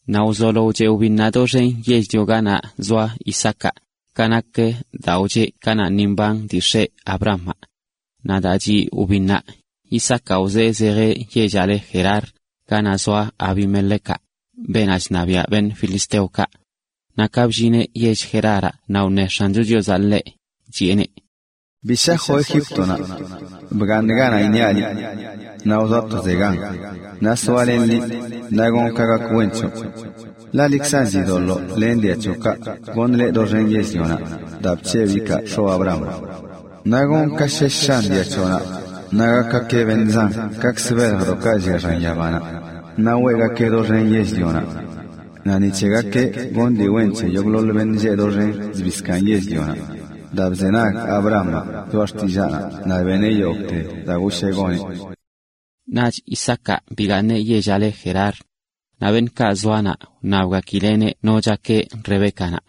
Naꞌ wzolo wcheꞌ wbinnaꞌ doxen yell-lio ganaꞌ zoa Isaacaꞌ, ka nak daa wcheꞌ kanaꞌ ni mban dii x̱eꞌ Abrahamaꞌ. Naꞌ daa chiꞌ wbinnaꞌ, Isaacaꞌ wzee zejeꞌ yellaꞌ le Gerar, ganaꞌ zoa Abimelecaꞌ, beenaꞌ chṉabiaꞌ filisteokaꞌ. Naꞌ ka bllineꞌ yell Geraraꞌ naꞌ wṉe X̱ancho Chiozaꞌ ḻeꞌ, chiꞌeneꞌ: “Bi shajoꞌ Egíptonaꞌ. Bgaaṉ ganaꞌ iṉiaꞌ liꞌ. Naꞌ wzoa tozegan, naꞌ soalenꞌ liꞌ, naꞌ gonꞌ ka gak wen c̱hoꞌ. Ḻaꞌ liꞌkzan chidoḻoo len dia c̱hoꞌkaꞌ goṉꞌ leꞌ doxen yell-lionaꞌ daa bc̱hebꞌ ikaa x̱oꞌ Abrahamaꞌ. Naꞌ gonꞌ ka shesh shan dia c̱hoꞌnaꞌ, naꞌ gakgakeꞌ beṉꞌ zan kakzə() beljdoꞌkaꞌ llia xan yabanaꞌ, naꞌ weꞌgakee doxen yell-lionaꞌ. Naꞌ ni c̱hegakeꞌ gonꞌ dii wen c̱he yogꞌḻoḻ beṉꞌ lleꞌ doxen zbii zkaaṉ yell-lionaꞌ, daa bzenag Abrahamaꞌ choꞌa xtillaanaꞌ naꞌ beneꞌ yogꞌte daa goshee goneꞌ.” Naꞌch Isaacaꞌ bigaaṉeꞌ yellaꞌ le Gerar. Naꞌ beṉꞌkaꞌ zoanaꞌ wṉabgakileꞌneꞌ no chakeꞌ Rebécanaꞌ.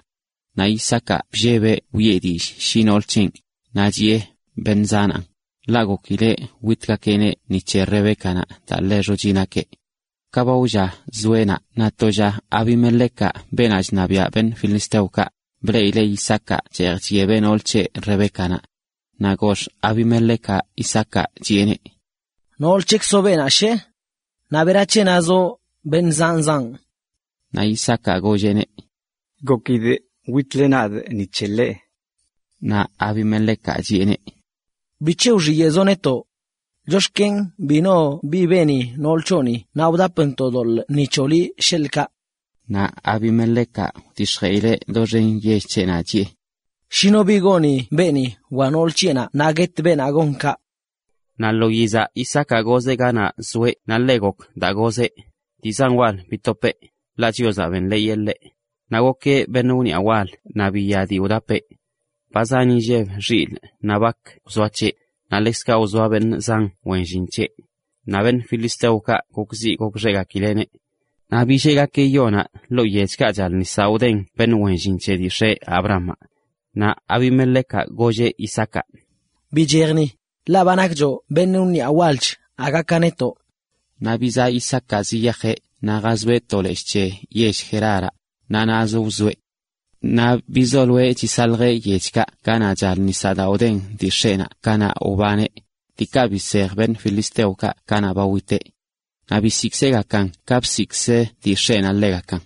Naꞌ Isaacaꞌ bllebeꞌ wiꞌe dillꞌ shi nool c̱henꞌ, naꞌ chiꞌe: “Beṉꞌ zanaan,” ḻaꞌ gokileꞌ witgakeꞌneꞌ ni c̱he Rebécanaꞌ daa ḻe xochi nakeꞌ. Ka ba wlla zoeꞌnaꞌ naꞌ to lla Abimelecaꞌ, beenaꞌ chṉabiꞌa filisteokaꞌ, bleꞌileꞌ Isaacaꞌ cheej chyebeꞌ nool c̱heꞌ Rebécanaꞌ. Naꞌ gox Abimelecaꞌ Isaacaꞌ, chiꞌeneꞌ: ―Nool c̱hekzoꞌ beenaꞌ, ¿she? Naꞌ ¿berac̱he nazoꞌ nakeꞌ beṉꞌ zanoꞌ? Naꞌ Isaacaꞌ golleꞌneꞌ: ―Gokidꞌ witle nadꞌ ni c̱heꞌ ḻeꞌ. Naꞌ Abimelecaꞌ chiꞌeneꞌ: ―¿Bic̱he wxiyeꞌzoꞌ netoꞌ? Chox̱ken bi no bi beni nool c̱hoꞌni naꞌ wdapntoꞌ doḻꞌ ni c̱hoꞌ liꞌ, sheḻꞌ kaꞌ. Naꞌ Abimelecaꞌ wdix̱jeꞌileꞌ doxen yell c̱heꞌnaꞌ, chiꞌe: ―Shi no bi goni beeni wa nool c̱heꞌnaꞌ naꞌ gonꞌ mandad guet beenaꞌ gon kaꞌ. Naꞌ lo yizaꞌ Isaacaꞌ gozeꞌ ganaꞌ zoeꞌ naꞌ ḻe wen gok daa gozeꞌ, dii zan wal bitopeꞌ, ḻaꞌ Chiozaꞌ benḻeeyeꞌ ḻeꞌ. Naꞌ gokeꞌ beṉꞌ wniꞌa wal naꞌ biya dii wdapeꞌ. Ba zan inlleb xilꞌ naꞌ bak wzoa c̱heꞌ, naꞌ ḻekzkaꞌ wzoa beṉꞌ zan wen llin c̱heꞌ. Naꞌ filisteokaꞌ gokxeꞌgakileꞌneꞌ. Naꞌ billeꞌgakeꞌ yonaꞌ ḻoo yechkaꞌ chal nisaꞌ wdeꞌn beṉꞌ wen llin c̱he dii x̱eꞌ Abrahamaꞌ. Naꞌ Abimelecaꞌ, golleꞌ Isaacaꞌ: ―Bichej ni, ḻaꞌ ba nakchoꞌ beṉꞌ wniꞌa walch aga ka netoꞌ. Naꞌ bizaꞌ Isaacaꞌ ziyajeꞌ naꞌ jazoeꞌ to leshꞌ c̱he yell Geraraꞌ, naꞌ naꞌzə wzoeꞌ. Naꞌ bizoloeꞌ chisaljeꞌ yechkaꞌ ganaꞌ chal nisaꞌ daa wdeꞌn dii x̱eꞌnaꞌ kanaꞌ wbaneꞌ, diikaꞌ bisej filisteokaꞌ kanaꞌ ba witeꞌ. Naꞌ bisiꞌkzeꞌgakan ka bsiꞌkzə dii x̱eꞌnaꞌ ḻegakan.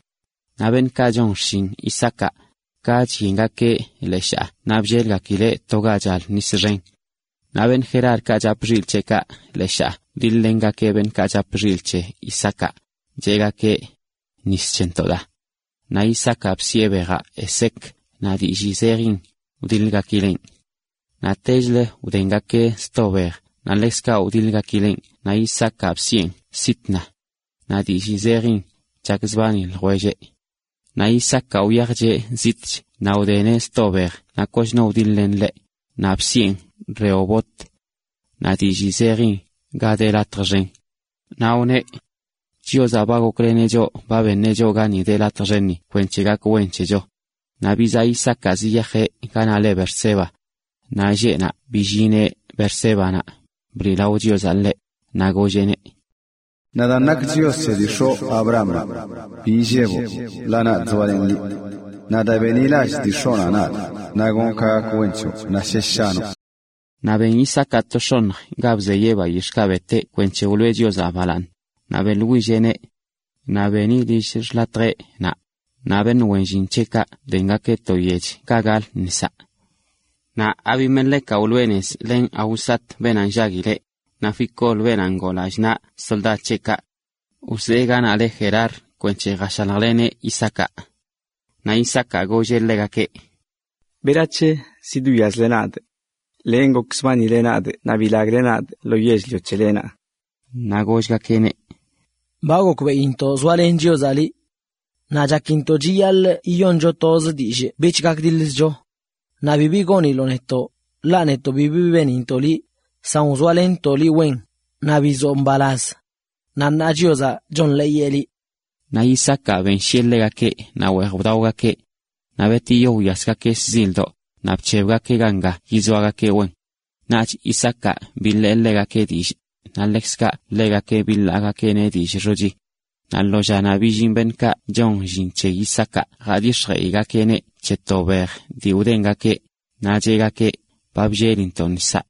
Naꞌ beṉꞌkaꞌ chon xshin Isaacaꞌ, ka chyengakeꞌ leshaa naꞌ bllelgakileꞌ to ga chal nis xen. Naꞌ beṉꞌ Gerarkaꞌ chap xilꞌ c̱heꞌkaꞌ leshaa wdiḻ-lengakeꞌ beṉꞌkaꞌ chap xilꞌ c̱he Isaacaꞌ, cheꞌgakeꞌ: “Nis c̱hentoꞌ daa.” Naꞌ Isaacaꞌ bsiꞌe bejaꞌ Esek. Naꞌ dillii zejin: wdiḻgakileꞌn. Naꞌtechlə wdengakeꞌ sto bej naꞌ ḻekzkaꞌ wdiḻgakileꞌn naꞌ Isaacaꞌ bsieꞌn Sitna. Naꞌ dillii zejin: chakzbani ljwelleꞌ. Naꞌ Isaacaꞌ wyajcheꞌ zitꞌch naꞌ wdeneꞌ sto bej naꞌ koch no widiḻ-len ḻeꞌ, naꞌ bsiꞌen Rehobot. Naꞌ dillii zejin “ga de latj xen”. Naꞌ wneꞌ: “Chiozaꞌ ba gokleneꞌ choꞌ ba beneꞌ gani de latj xenni kwenc̱he gak wen c̱hecho.” Naꞌ bizaꞌ Isaacaꞌ ziyajeꞌ ganaꞌ le Beerseba. Naꞌ lleꞌnaꞌ billineꞌ Beersébanaꞌ, bliꞌlao Chiozaꞌ ḻeꞌ, naꞌ golleꞌneꞌ: “Nadaan nakꞌ Chios c̱he dii x̱oꞌ Abrahamaꞌ. Bi illeboꞌ, ḻaꞌ nadꞌ zoalenꞌ liꞌ. Naꞌ daa benḻilallꞌ dii x̱oꞌnaꞌ nadꞌ naꞌ gonꞌ ka gak wen c̱hoꞌ naꞌ shesh shanoꞌ.” Naꞌ ben Isaacaꞌ to x̱oṉj ga bzeyeꞌ bayix̱ꞌkaꞌ beteꞌ kwenc̱he beꞌlawee Chiozaꞌ, naꞌ beꞌḻwilleꞌneꞌ. Naꞌ beni lill xḻatjeꞌ naꞌ, naꞌ beṉꞌ wen llin c̱heꞌkaꞌ wdengakeꞌ to yech ga gal nisaꞌ. Naꞌ Abimelecaꞌ wloꞌe nez len Ahuzat, beenaꞌ nllaguileꞌ, naꞌ Ficol, beenaꞌ ngoo lallꞌ naꞌ soldad c̱heꞌkaꞌ. Wzee ganaꞌ le Gerar kwenc̱he lljashaljleneꞌ Isaacaꞌ. Naꞌ Isaacaꞌ golleꞌ ḻegakeꞌ: ―¿Berac̱he zidwiazle nadꞌ? Len gokzbanile nadꞌ naꞌ bilagle nadꞌ lo yell-lio c̱helenaꞌ. Naꞌ gollgakeꞌneꞌ: ―Ba gokbeꞌintoꞌ zoalen Chiozaꞌ liꞌ. Naꞌ chakintoꞌ chiyaḻꞌ yiyoncho toz dillꞌ bich gakdiḻzcho. Naꞌ bibi goniloꞌ netoꞌ, ḻaꞌ netoꞌ bibi benintoꞌ liꞌ, san wzoalenntoꞌ liꞌ wen, naꞌ bizoo mbalaz. Naꞌ ṉaa Chiozaꞌ chonḻeeyeꞌ liꞌ. Naꞌ Isaacaꞌ benshiꞌe ḻegakeꞌ, naꞌ weej wdaogakeꞌ. Naꞌ betiyo wyasgakeꞌ shzildoꞌ, naꞌ bc̱hebgakeꞌ ganga yizoagakeꞌ wen. Naꞌch Isaacaꞌ biḻee ḻegakeꞌ dillꞌ, naꞌ ḻekzkaꞌ ḻegakeꞌ biḻaagakeꞌneꞌ dillꞌ xochi. Naꞌ lo llanaꞌ billin beṉꞌkaꞌ chon llin c̱he Isaacaꞌ jadix̱jeꞌgakeꞌneꞌ c̱he to bej dii wdengakeꞌ, naꞌ cheꞌgakeꞌ: ―Ba bllelintoꞌ nisaꞌ.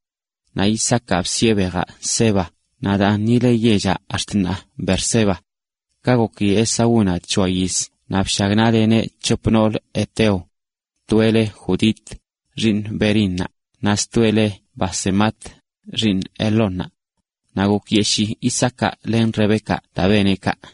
Naꞌ Isaacaꞌ bsiꞌe bejaꞌ Seba, naꞌ daan ni le yellaꞌ ax̱t ṉaa, Beerseba. Ka goki Esaúnaꞌ c̱hoa yiz naꞌ bshagnaꞌleneꞌ c̱hop noolə heteo. Toeꞌ leꞌ Judit, xiiṉ Beerinaꞌ, naꞌ stoeꞌ le Basemat, xiiṉ Elónnaꞌ. Naꞌ gokyeshii Isaacaꞌ len Rebécanaꞌ daa beneꞌ kaꞌ.